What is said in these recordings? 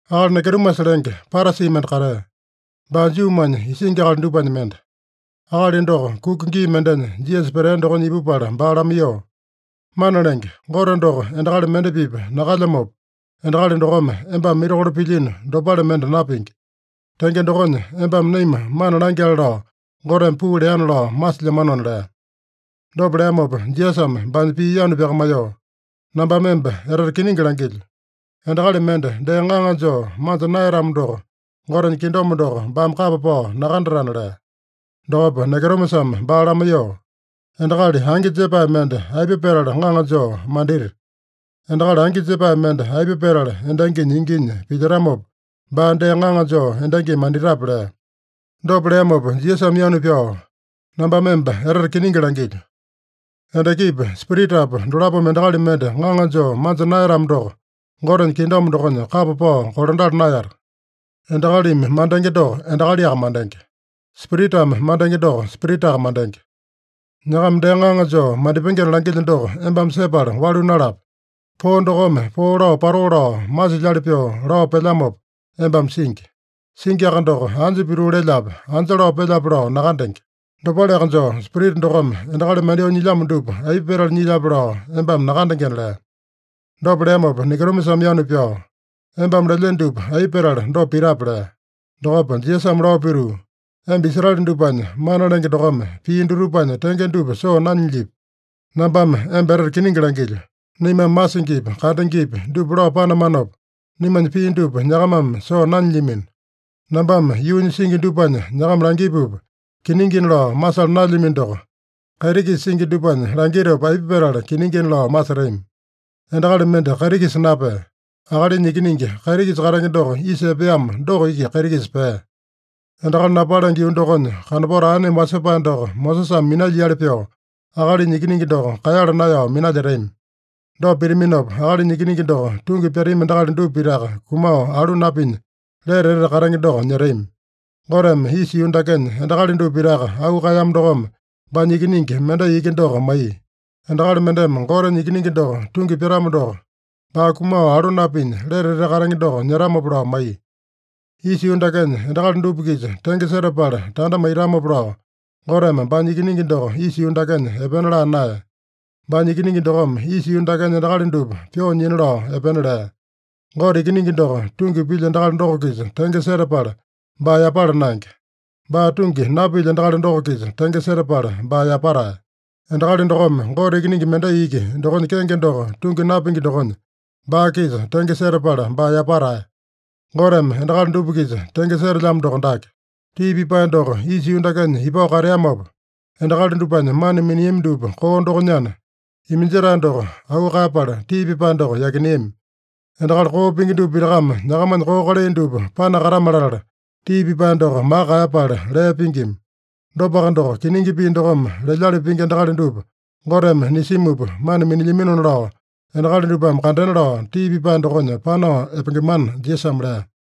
Akali Nikodimasa lenge, Parasi mende katea. Baa Juumanya isingi akali dupanya mende. Akali doko kuka gii mendenya Jisasa petea dokonya ipupala baa lamaiyoo, “Mana Lenge, Gote doko endakali mende-pipa nakalyamopa, endakali dokome embame mirakolo pilyino dopale mende napingi. Tenge dokonya, embame naima mana langyale lao Goteme puu leana lao masilyamanona” lea. Dopa leamopa Jisasame baanya pii yanu pyakamaiyoo, “Nambame emba etete kiningi langilyo: Endakali mende dee ŋaŋa joo manja naeyatamo doko, Gotenya kingdom doko baame kapa pao nakandatana” lea. Dokopa Nikodimasame baa lamaiyoo, “Endakali angi jepae mende aipa petala ŋaŋa joo mandita? Endakali angi jepae mende aipa petala endanginya inginya pilyetamopa, baa dee ŋaŋa joo endangimi manditape?” lea. Dopa leamopa Jisasame yanu pyao, “Nambame emba etete kiningi langilyo: Endakipa Spiritapa dolapome endakali mende ŋaŋa joo manja naeyatamo doko, Gotenya Kingdom dokonya kapa pao kolandala naeyata. Endakalimi mandenge doko endakaliaka mandenge. Spiritame mandenge doko spiritaka mandenge. Nyakama dee ŋaŋa joo mandipengena langilyo doko embame sepala walu nalape. Poo dokome poo lao patoo lao masilyali pyoo lao pelyamopa embame singi. Singiaka doko, anja pituu lelyape, anja lao pelyape lao nakandenge. Dopaleaka joo, Spirita dokome endakali mandyoo nyilyamo dupa aipa petala nyilyape lao embame nakandengena” lea. Dopa leamopa Nikodimasame yanu pyao, “Embame lelyeno dupa aipa petala dopa pitape?” lea. Dokopa Jisasame lao pituu, “Emba Israele dupanya mana lenge dokome pii dutupanya tenge dupa soo nanyilyipi? Nambame emba etete kiningi langilyo: Naimame masingipi, kandengepi dupa lao panamanopa, naimanya pii dupa nyakamame soo nanyilyamino. Nambame yuunya singi dupanya nyakama langipupa kiningina lao masala naelyamino doko, kaiti-kisa singi dupanya langitopa aipa petala kiningina lao masetami? Endakali mende kaiti-kisa napea. Akalinya Ikiningi, kaiti-kisa katenge doko isa epeamo doko iki kaiti-kisa pea. Endakali napalenge yuu dokonya kanopato aeneme wasepae doko Mosesame minalyiali pyoo, Akalinya Ikiningi doko kaeyala naeyao minalyetami. Dopa pitaminopa, Akalinya Ikiningi doko tungi pyatami endakali dupa pitaka kumao alu napinya, lete etete katenge doko nyetami. “Goteme isa yuu dakenya endakali dupa pitaka auu kaeyamo dokome, baanya Ikiningi mendai iki doko maiya. Endakali mendeme Gotenya Ikiningi doko tungi pyatamo doko, baa kumao alu napinya, lete etete katenge doko nyetamopa lao maiya. Isa yuu dakenya endakali dupa-kisa tenge setapala tanda maitamopa lao, Goteme baanya Ikiningi doko isa yuu dakenya epena laa naeya. Baanya Ikiningi dokome isa yuu dakenya endakali dupa pyoo nyina lao epena lea. Gote Ikiningi doko tungi pilya endakali doko-kisa tenge setapala baa yapala naenge. Baa tungi napilya endakali doko-kisa tenge setapala baa yapatae. Endakali dokome Gote Ikiningi mendai iki dokonya kenge doko tungi napingi dokonya, baa-kisa tenge setapala baa yapatae. Goteme endakali dupa-kisa tenge setelyamo doko dake: Tii pipae doko isa yuu dakenya ipao kateamopa, endakali dupanya mana miniami dupa koo dokonyana, iminjetae doko auu kaeyapala tii pipae doko yakineami. Endakali koo pingi dupa pitakame nyakamanya koo kalai dupa panakatame-latala, tii pipae doko maka kaeyapala lee pingima. Dopaka doko, kiningi pii dokome lelyali pingi endakali dupa Goteme nisimupa mana minilyaminona lao endakali dupame kandena lao, tii pipae dokonya panao epengemana” Jisasame lea.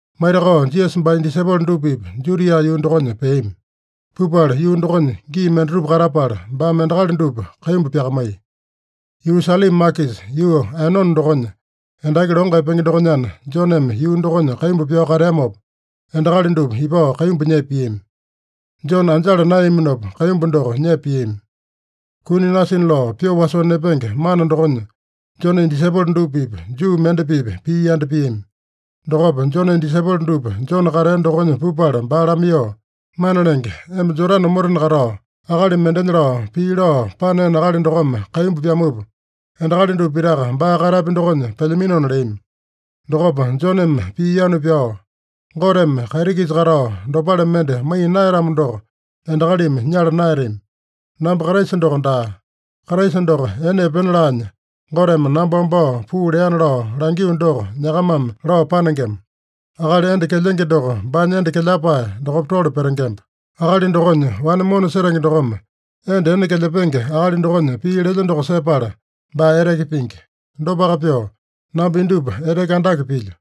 Maitakao Jisasa baanya disaipolo dupa-pipa Judia yuu dokonya peami. Pupala yuu dokonya gii mendatupa katapala, baame endakali dupa kaimbu pyakamaiya. Yuu Salima makisa, yuu Aenone dokonya endaki longo epenge dokonyana, Joneme yuu dokonya kaimbu pyao kateamopa, endakali dupa ipao kaimbu nyepa piami. (Jone anjala naeyaminopa kaimbu doko nyepa piami.) Kuni nasina lao pyoo wasoo nepenge mana dokonya Jonenya disaipolo dupa-pipa Juu mende-pipa pii yanda piami. Dokopa Jonenya disaipolo dupa Jone katea dokonya pupala baa lamaiyoo, “Mana Lenge, emba Jodane omotena katao, akali mendenya lao pii lao paneeno akali dokome kaimbu pyamupa, endakali dupa pitaka baa katapya dokonya pelyaminona” leami. Dokopa Joneme pii yanu pyao, “Goteme kaiti-kisa katao dopale mende maiya naeyatamo doko, endakalimi nyala naeyatami. Namba Kraisa doko daa. Kraisa doko ene epena laanya, Goteme namba wambao puu leana lao langio doko nyakamame lao panengema. Akali enda kelyenge doko baanya enda kelyapae dokopa tole petengemba. Akali dokonya wane mona setenge dokome enda ene kelyapenge akali dokonya pii lelya doko sepala, baa eteke pingi. Dopaka pyoo namba indupa eteke andake pilyo.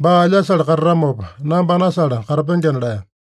Baa alyasale katatamopa, namba anasale katapengena” lea.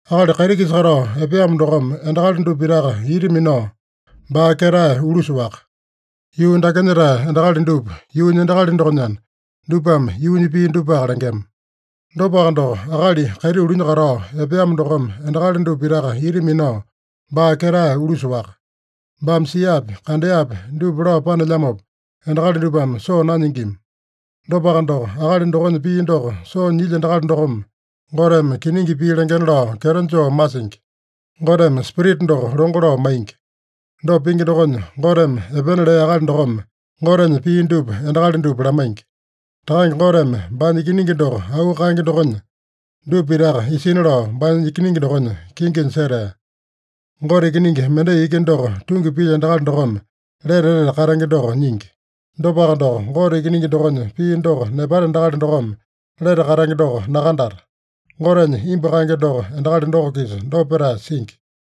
Akali kaiti-kisa katao epeamo dokome endakali dupa pitaka ita minao, baa ketae ulusa-waka. Yuu dakenya-tae endakali dupa yuunya endakali dokonyana, dupame yuunya pii dupaka lengema. Dopaka doko, akali kaiti ulunya katao epeamo dokome endakali dupa pitaka ita minao, baa ketae ulusa-waka. Baame siapi, kandeapi dupa lao panelyamopa, endakali dupame soo nanyingima. Dopaka doko, akali dokonya pii doko soo nyilya endakali dokome, Goteme kiningi pii lengena lao kyeto joo masingi. Goteme Spirita doko longo lao maingi. Dopa pingi dokonya, Goteme epena lea akali dokome Gotenya pii dupa endakali dupa lamaingi. Takange Goteme baanya Ikiningi doko auu kaenge dokonya, dupa pitaka isina lao baanya Ikiningi dokonya kinginya setea. Gote Ikiningi mendai iki doko tungi pilya endakali dokome lete etete katenge doko nyingi. Dopaka doko, Gote Ikiningi dokonya pii doko nepata endakali dokome lete katenge doko nakandata. Gotenya imbu kaenge doko endakali doko-kisa dopa petae singi.